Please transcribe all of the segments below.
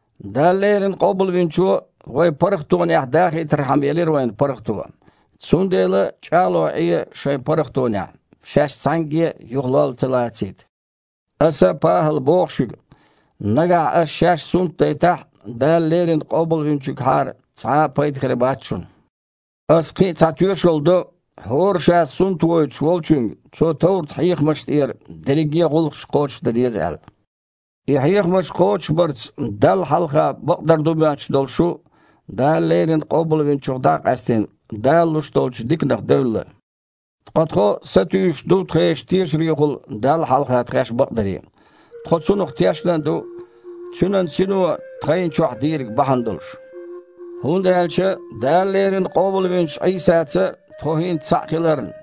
Дала леррина Къобалвинчо вай паргІатонехь дахийтархьама елира вайна паргІато. Цундела чІагІлой Іе шайн паргІатонехь, шаьш цхьаьнгге а юха а лолла ца лацийта. Аса, ПахІала, боху шуьга: нагахь аша шаьш сунтдайтахь а, Дала леррина Къобалвинчуьнгахьара цхьа а пайда хир бац шуна. Аса кхин а цхьа тоьшалла до хІора ша сунтвойтуш волчуьнга, цо товрат-хьехамаш тІера дерриге а гІуллакхаш кхочушдан деза аьлла. И хьехамаш кхочушбарца Далла хьалха бакъдар ду моьттуш долу шу, Дала леррина Къобалвинчух дІа а къаьстина, Дала луш долчу диканах девлла. Ткъа тхо сатуьйсуш ду тхешан тешарехула Далла хьалха тхаьш бакъдаре. Тхо цунах тешна а ду, Цуьнан Сино тхайна чохь дийриг бахьана долуш. ХІунда аьлча Дала леррина къобалвинчу Іийсаца тхо хІинца цхьаъ хиларна,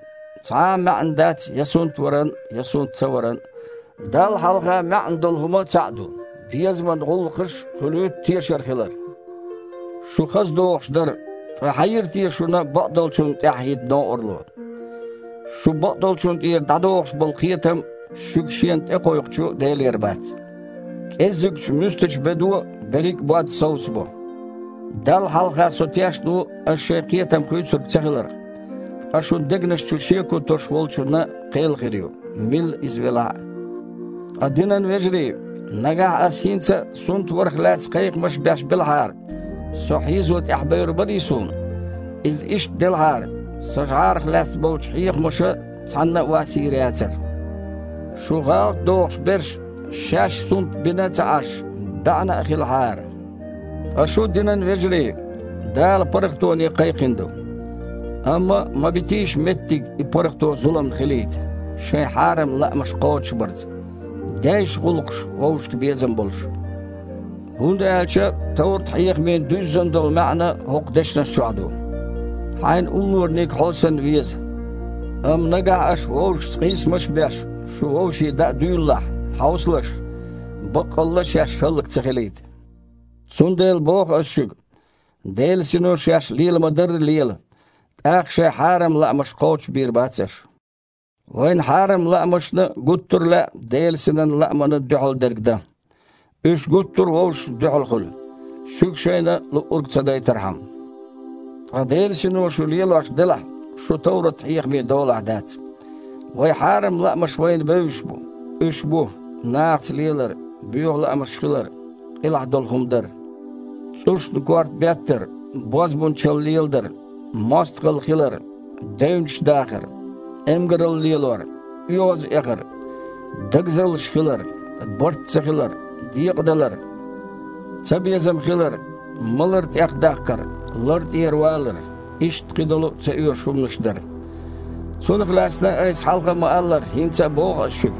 цхьа а маьІна дац я сунтваран а, я сунт ца варан а. Далла хьалха маьІна долу хІума цхьаъ ду: безаман гІуллакхаш хуьлуьйту тешар хилар. Шу хаза догІуш дара. Ткъа хьан йира те шуна бакъдолчунна тІаьхьахІитта новкъарло? Шу бакъдолчунна тІера дІадохуш болу кхетам шуьга Шена тІекхойкхучу Делера бац. «КІеззигчу муьстачу бедо берриг а бод совсабо». Далла хьалха со тешна ву аша шайн кхетам хуьйцург ца хиларх, ткъа шун дегнаш чу шеко тосуш волчунна кхел хир ю, милла а иза велахь а. Ткъа, динан вежарий, нагахь аса хІинца а сунтварах лаьцна кхайкхамаш беш белахьара, со хьийзо тІаьхьабевр барий суна? Иза иштта делахьара, сан жІарах лаьцна болчу хьехамаша цхьанна а вас йийр яцара! Шу гІалатдохуш берш, шаьш сунтбина а ца Іаш, баьІна а хилахьара! Ткъа шу, динан вежарий, Дала паргІатоне кхайкхина ду. Амма ма битийша меттиг и паргІато зуламна хилийта, шайн хьарам лаамаш кхочушбарца. Дейша гІуллакхаш вовшашка безам болуш. ХІунда аьлча товрат-хьехамийн дуьззина долу маьІна хІокху дешнаш чохь ду: «Хьайна уллораниг, хьо санна, веза». Амма, нагахь аша вовшашца къийсамаш а беш, шу вовшийн даа дуьйлалахь, хьовсалаш, баккъалла а шаьш а хІаллак ца хилийта! Цундела боху ас шуьга, Делан Сино шаьш лела ма-дарра лела, тІаккха шайн хьарам лаамаш кхочушбийр бац аша. Вайн хьарам лаамашна гуттара а лаьа Делан Синан лаамана дуьхьал дерг дан. Уьш гуттара а вовшашна дуьхьал хуьлу, шуьга шайна луург ца дайтархьама. Ткъа Делан Сино шу лелош делахь, шу товрат-хьехамийн долахь дац. Вайн хьарам лаамаш вайна бевзаш бу. Уьш бу: нахаца лелар, боьха лаамаш хилар, къилахь долу хІума дар, цІушна корта беттар, бозбунчалла леладар, мостагІалла хилар, девнаш дахар, эмгаралла лелор, оьгІазъэхар, дагазаллаш хилар, барт ца хилар, декъадалар, цабезам хилар, малар тІехдаккхар, лар тІера валар, иштта кхидолу а ца оьшу хІуманаш дар. Цунах лаьцна, айса хьалха а ма-аллара, хІинца а боху аса шуьга,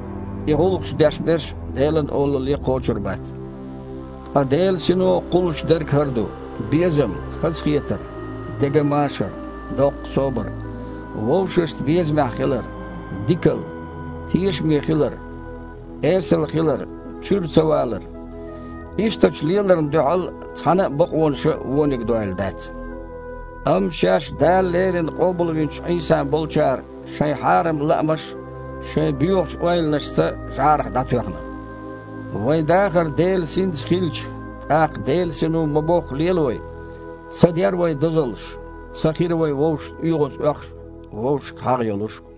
и гІуллакхаш деш берш Делан Олалле кхочур бац. Ткъа Делан Сино кхуллуш дерг хІара ду: безам, хазахетар, деган машар, доккха собар, вовшашца безамехь хилар, дикалла, тешаме хилар, эсала хилар, чуьра ца валар. Ишттачу леларна дуьхьал цхьана а бакъонаша а вониг дойла дац. Амма шаьш Дала леррина къобалвинчу Іийсан болчара шайн хьарам лаамаш, шайн боьхачу ойланашца, жІарах дІатоьхна. Вайн дахар Делан Синца хилча, тІаккха Делан Сино ма-бохху лела вай. Ца дер вай дозаллаш. Ца хир вай вовшашна оьгІазъоьхуш а, вовшашка хьагІ йолуш а.